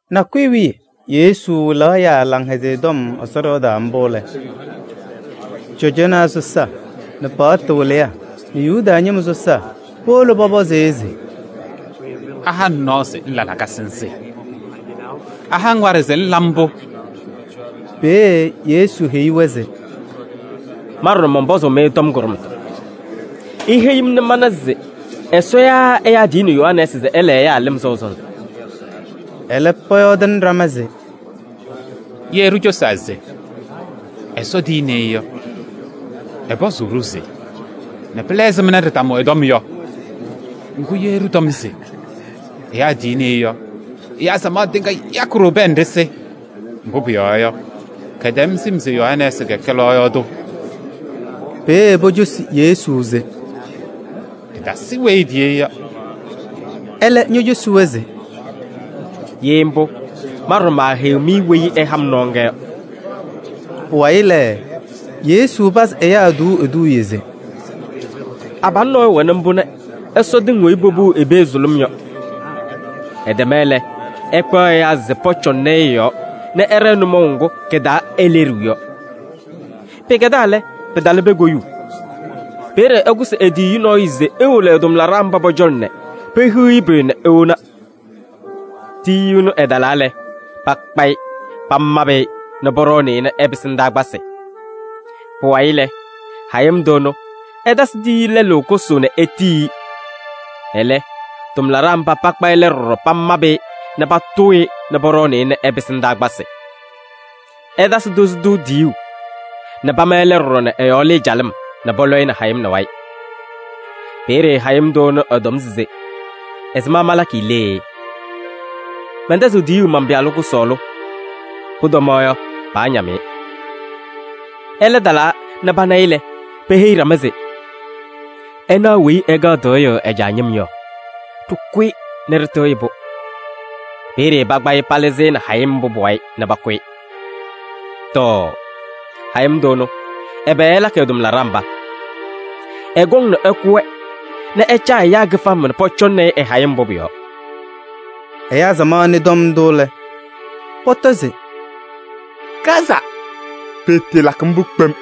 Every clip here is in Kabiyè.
Nakʋyʋ wiye Yesu wɩlaɣ ɛyaa Laŋhɛzɩyɛ Tɔm Ɛsɔ ɖɩɣa taa mbʋ lɛ, cɔjɔnaa sɔsaa nɛ paɣtʋ wɩlɩyaa nɛ Yuda ñɩma sɔsaa powolo pɔpɔzɩ-ɩ se: “Aha-ŋ nɔɔ se ŋla lakasɩ nzɩ? Aha-ŋ waɖɛ se ŋla mbʋ?” Peeye Yesu heyi-wɛ se: “Ma ɖɔɖɔ, mɔnpɔzʋʋ-mɩ tɔm kʋɖʋmtʋ. Iheyi-m nɛ mana se Ɛsɔ yaa ɛyaa tiyini Yohanɛɛsɩ se ɛla ɛyaa lɩm sɔʋ sɔnzɩ?” Ɛlɛ, pɔyɔɔdɩnɩ ɖama se: “Ye ɖicosaa se: ‘Ɛsɔ tiyini-i’ yɔ, ɛpɔzʋʋ-ɖʋ se: ‘Nɛ pɩla ɛzɩma ɖɩtamʋ ɛ-tɔm yɔ?’ Ŋgʋ, ɖɩtɔm se: ‘Ɛyaa tiyini-i’ yɔ, ɛyaa samaɣ tɩŋa yakɩ-ɖʋ pɛɛ nɛ ɖɩsɩ. Mbʋ pʋyɔɔ yɔ, kɛtɛm sɩm se Yohanɛɛsɩ kɛkɛ lɔɔyaɣ tʋ.” Peeye pocosi Yesu se: “Ɖɩtasɩ weyi etiyi-i yɔ.” Ɛlɛ ñocosi-wɛ se: “Ye mbʋ, ma ɖɔɖɔ maaheyiɣ-mɩ weyi ɛha-m nɔɔ ŋga yɔ.” Pʋwayɩ lɛ, Yesu pazɩ ɛyaa tuuu eduuye se: “Abalʋ nɔɔyʋ wɛnɩ mbʋ nɛ ɛsɔ tɩŋ weyi popuu i-pee sʋlʋm yɔ. Ɛtɛma lɛ, ɛkpaɣ ɛyaa se pɔcɔŋnɩ-ɩ ɩ-yɔɔ nɛ ɛɖɛɛ nʋmɔʋ ŋgʋ kɩ-taa eleɖiɣ yɔ. Pɩkɛdaa lɛ, pɩtalɩ pee koyuu. Peeye ɛkʋsɩ e-tiyiyu nɔɔyʋ se ewolo ɛ-tʋmlaɖaa mba pɔ-cɔlɔ nɛ pehiɣ-i pʋyʋ nɛ ewona. Tiyiyu ɛnʋ ɛtalaa lɛ, pakpa-ɩ pamabɩ-ɩ nɛ pɔɖɔɔnɩ-ɩ nɛ ɛpɩsɩ ndaakpasɩ. Pʋwayɩ lɛ, hayɩm tʋ ɛnʋ ɛtasɩ tiyiyu lɛlʋ kʋsʋʋ nɛ etiyi-i. Ɛlɛ, tʋmlaɖaa mba pakpa ɛlɛ ɖɔɖɔ pamabɩ-ɩ nɛ patʋʋ-ɩ nɛ pɔɖɔɔnɩ-ɩ nɛ ɛpɩsɩ ndaakpasɩ. Ɛtasɩ tozo tʋ tiyuu nɛ pama ɛlɛ ɖɔɖɔ nɛ ɛ-yɔɔ lɩɩ calɩm nɛ pɔlɔ-ɩ nɛ hayɩm wayɩ. Peeye hayɩm tʋ ɛnʋ ɛtɔm se: ‘Ɛzɩma malakɩ lee? Mɛntɛzɩɣ tiyuu man-pɩyalʋ kʋsɔɔlʋ. Pʋtɔmaɣ yɔ, paañam-ɩ.’ Ɛlɛ talaa nɛ pana-ɩ lɛ, peheyi ɖama se: ‘Ɩnaɣ weyi ɛkaɣ tɩɣyʋʋ ɛ-caa ñɩm yɔ. Ɖɩkʋ-ɩ nɛ ɖɩtɩɣyɩ-pʋ.’ Peeye pakpa-ɩ palɩzɩ-ɩ nɛ hayɩm mbʋ pʋ-wayɩ nɛ pakʋ-ɩ. Tɔɔ! Hayɩm tʋ ɛnʋ, ɛbɛ ɛlakɩ ɛ-tʋmlaɖaa mba? Ɛkɔŋ nɛ ɛkʋ-wɛ nɛ ɛcaa ɛyaa kɩfama nɛ pɔcɔŋnɩ-ɩ ɛ-hayɩm mbʋ pʋ-yɔɔ.” Ɛyaa samaɣ nɩ tɔm ndʋ lɛ, pɔtɔ se: “Kaza! Pɩɩtɩɩlakɩ mbʋ kpem!”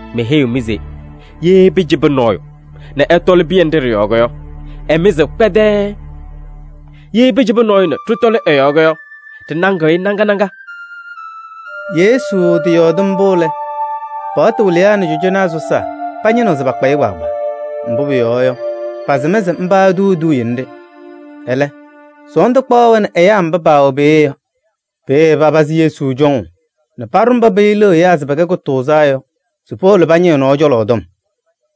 Meheyiɣ-mɩ se: ye pɩcɩbɩ nɔɔyʋ nɛ ɛtɔlɩ pɩyɛ nɖɩ ɖɩ-yɔɔ yɔ, ɛmɩzɩɣ kpɛdɛɛɛ. Ye pɩcɩbɩ nɔɔyʋ nɛ ɖɩtɔlɩ ɛ-yɔɔ yɔ, ɖɩnaŋɩɣ-ɩ naŋa naŋa.” Yesu tɩyɔɔdɩ mbʋ lɛ, paɣtʋ wɩlɩyaa nɛ cɔjɔnaa sɔsaa pañɩnɩɣ se pakpa-ɩ kpaagbaa. Mbʋ pʋyɔɔ yɔ, pasɩm se mba etuuni eduuye nɖɩ. Ɛlɛ, sɔɔndʋ kpaɣaɣ-wɛ nɛ ɛyaa mba paawɛ peeye yɔ. Peeye papazɩ Yesu cɔŋʋʋ nɛ paɖʋ mba peyiliɣ ɛyaa se pɛkɛ kʋtʋʋzaa yɔ se powolo pañɩ ɛ-nɔɔ cɔlɔ tɔm.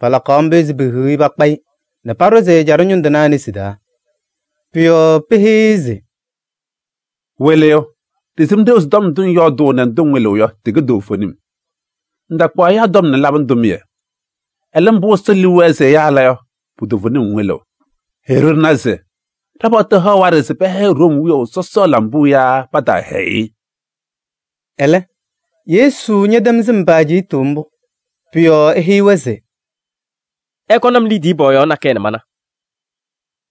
Palakaɣ mbʋ se pehiɣ-i pakpa-ɩ nɛ paɖʋzɩ ɛjaɖɛ ñʋŋ tɩnaa nesi taa. Pʋ-yɔɔ peheyi-i se: “Wɩlɩyʋ! Ɖɩsɩm ɖeu se tɔm ndʋ ŋyɔɔdʋʋ nɛ ndʋ ŋwɩlɩɣ yɔ, tɩkɛ toovenim. Ŋtakpaɣ ɛyaa tɔm nɛ ŋlabɩnɩ tʋmɩyɛ. Ɛlɛ, mbʋ Ɛsɔ liu wɛɛ se ɛyaa ɛla yɔ, pu-toovenim ŋwɩlɩɣ. Heyi-ɖʋ nɛ ɖɩna se ɖa-paɣtʋ haɣ waɖɛ se pɛhɛyɩ Room wiyaʋ sɔsɔ lambuu yaa pataahɛyɩ-ɩ?” Ɛlɛ, Yesu ñɛtɛm sɩm pa-ajiitu mbʋ. Pʋ-yɔɔ eheyi-wɛ se: “Ɩkɔnɩ-m liidiye pɔɔyaɣ nakɛyɛ nɛ mana.”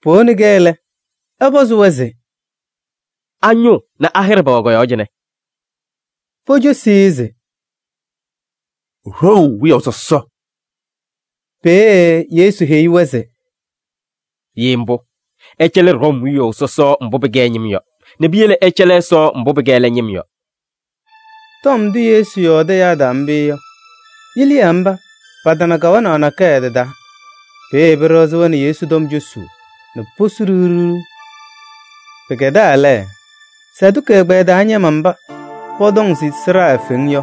Powoni-kɛ lɛ, ɛpɔzɩ-wɛ se: “A-ñʋʋ nɛ a-hɩɖɛ pɛwɛ kɔ-yɔɔ cɩnɛ?” Pocosi-i se: “Room wiyaʋ sɔsɔ.” Peeye Yesu heyi-wɛ se: “Ye mbʋ, ɩcɛlɩ Room wiyaʋ sɔsɔ mbʋ pɩkɛ ɛ-ñɩm yɔ nɛ piyele ɩcɛlɩ Ɛsɔ mbʋ pɩkɛ ɛlɛ ñɩm yɔ.” Tɔm ndʋ Yesu yɔɔdɩ ɛyaa taa mbʋ yɔ, yiliyaa mba patana kawanaɣ nakɛyɛ tɩ-taa. Peeye pɩɖɩɣzɩ-wɛ nɛ Yesu tɔm cosuu nɛ posu ɖiɣ ɖiɣ. Pɩkɛdaa lɛ, Saduki ɛgbɛyɛ taa ñɩma mba pɔtɔŋ se sɩɖaa eefeŋ yɔ,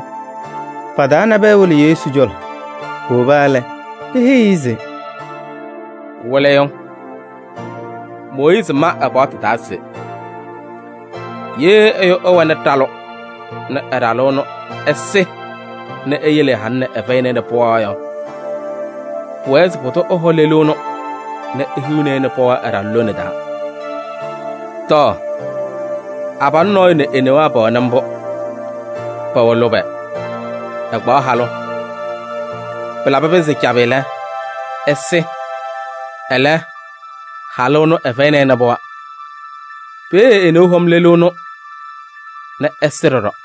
pa-taa nabɛyɛ wolo Yesu cɔlɔ. Powoba lɛ, peheyi-i se: “Wɩlɩyʋ! Mooyiizi ma ɛ-paɣtʋ taa se: ‘Ye ɛyʋ ɛwɛnɩ ɖalʋ nɛ ɛ-ɖalʋ ɛnʋ ɛsɩ nɛ eyele ɛ-halʋ nɛ ɛfɛyɩnɩ-ɩ pɩɣa yɔ, pʋwɛɛ se pʋdʋ ɛhɔ lelu ɛnʋ nɛ ehiɣni-i pɩɣa ɛ-ɖalʋ lone taa.’ Tɔɔ! Abalʋ nɔɔyʋ nɛ e-newaa pɛwɛnɩ mbʋ, pɛwɛ lʋbɛ, ɛkpaɣ halʋ. Pɩlabɩ pɩnzɩ cabɩ lɛ, ɛsɩ, ɛlɛ halʋ ɛnʋ ɛfɛyɩnɩ-ɩ pɩɣa. Peeye e-neu hɔm lelu ɛnʋ nɛ ɛsɩ ɖɔɖɔ.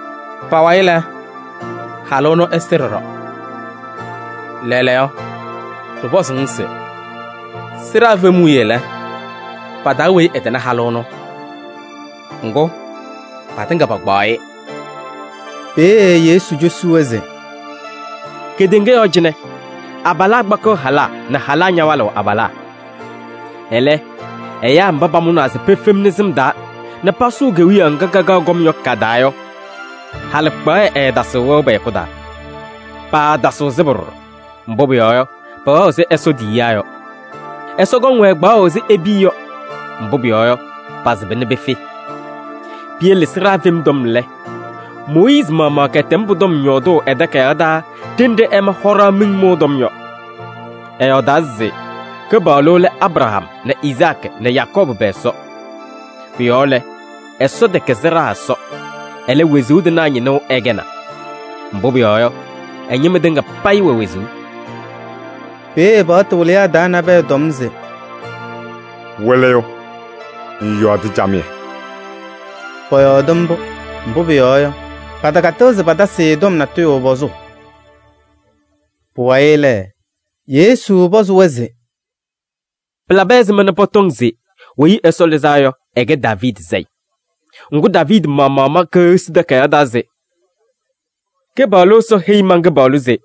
Pa-wayɩ lɛ, halʋ ɛnʋ ɛsɩ ɖɔɖɔ. Lɛɛlɛɛyɔ, ɖɩpɔzʋʋ-ŋ se: sɩɖaa fem wiye lɛ, pa-taa weyi ɛtɩnɩ halʋ ɛnʋ? Ŋgʋ, patɩŋa pakpaɣ-ɩ!” Peeye Yesu cosi-wɛ se: “Kedeŋa yɔɔ cɩnɛ abalaa kpakɩɣ halaa nɛ halaa ñawalɩɣ abalaa. Ɛlɛ, ɛyaa mba pamʋnaa se pefemni sɩm taa nɛ pasʋʋ Kewiyaɣ ŋga kakaɣ kɔm yɔ ka-taa yɔ, halɩkpaɣyɛ ɛɛtasɩɣ wɛʋ pɛ-hɛkʋ taa. Paatasɩɣ sɩbʋ ɖɔɖɔ, mbʋ pʋyɔɔ yɔ, pɛwɛɣ ɛzɩ Ɛsɔ tiyiyaa yɔ. Ɛsɔ kɔŋ-wɛ kpaɣʋ ɛzɩ e-piya yɔ, mbʋ pʋyɔɔ yɔ, pasɩba nɛ pefe. Piyele sɩɖaa fem tɔm lɛ, Mooyiizi maɣmaɣ kɛtɛm pʋ-tɔm yɔɔdʋʋ ɛ-takayaɣ taa ɖenɖe ɛma hɔɖaɣ miŋ mʋʋ tɔm yɔ. Ɛyɔɔdaa se Kɩpaɣlʋ lɛ Abraham nɛ Izaakɩ nɛ Yakɔɔbʋ pɛ-Ɛsɔ. Pʋ-yɔɔ lɛ, Ɛsɔ tɛkɛ sɩɖaa Ɛsɔ, ɛlɛ, wezuu tɩnaa ñɩnʋ ɛkɛnaa. Mbʋ pʋyɔɔ yɔ, ɛ-ñɩma tɩŋa payɩ wɛ wezuu.” Peeye paɣtʋ wɩlɩyaa taa nabɛyɛ tɔm se: “Wɩlɩyʋ! Ŋyɔɔdɩ camɩyɛ.” Pɔyɔɔdɩ mbʋ, mbʋ pʋyɔɔ yɔ, patakatɩɣ se patasɩ-ɩ tɔm natʋyʋ pɔzʋʋ. Pʋwayɩ lɛ, Yesu pɔzɩ-wɛ se: “Pɩlabɩ ɛzɩma nɛ pɔtɔŋ se Weyi Ɛsɔ Lɩzaa Yɔ ɛkɛ Daaviidi sayɩ? Ŋgʋ, Daaviidi maɣmaɣ ma Keɣsi Takayaɣ taa se: ‘Kɩpaɣlʋ Ɛsɔ heyi man-Kɩpaɣlʋ se: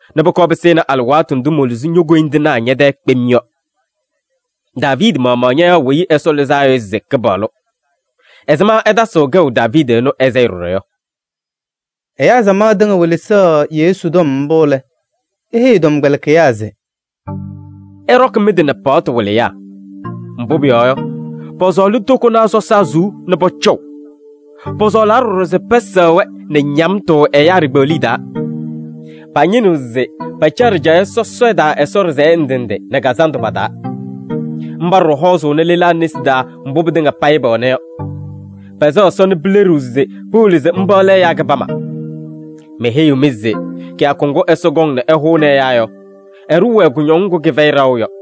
nɛ pʋkɔɔ pɩsɩnɩ alɩwaatʋ ndʋ moluzi ño-koyindinaa ñɛ-tɛɛ kpem yɔ.’ Daaviidi maɣmaɣ ñayaɣ Weyi Ɛsɔ Lɩzaa Yɔ se Kɩpaɣlʋ. Ɛzɩma ɛtasɩɣ kɛʋ Daaviidi ɛnʋ ɛ-sayɩ ɖɔɖɔ yɔ?” Ɛyaa samaɣ tɩŋa welesaɣ Yesu tɔm mbʋ lɛ, eheyi ɛ-tɔmkpɛlɩkɩyaa se: “Ɩɖɔkɩ mɩ-tɩ nɛ paɣtʋ wɩlɩyaa. Mbʋ pʋyɔɔ yɔ, pɔsɔɔlɩ tokonaa sɔsaa suu nɛ pɔcɔʋ. Pɔsɔɔlaa ɖɔɖɔ se pɛsɛɣ-wɛ nɛ ñamtʋ ɛyaa ɖikpeɣliye taa. Pañɩnɩɣ se pacaɣ ɖɩjaɣyɛ sɔsɔɖɛ taa Ɛsɔ ɖɩsɛyɛ ndɩ ndɩ nɛ kazandʋ pa-taa. Mba ɖɔɖɔ hɔɔzʋʋnɩ lelaa nesi taa mbʋ pɩtɩŋa payɩ pɛwɛna yɔ. Pɛsɛɣ Ɛsɔ nɛ pɩɖaɣlɩɣ se pɩwɩlɩ se mba lɛ ɛyaa kɩbama. Meheyiɣ-mɩ se kɩyakʋ ŋgʋ Ɛsɔ kɔŋ se ɛhʋnɩ ɛyaa yɔ, ɛɖʋʋ-wɛ kʋñɔŋ ŋgʋ kɩfɛyɩ ɖaɣʋ yɔ.”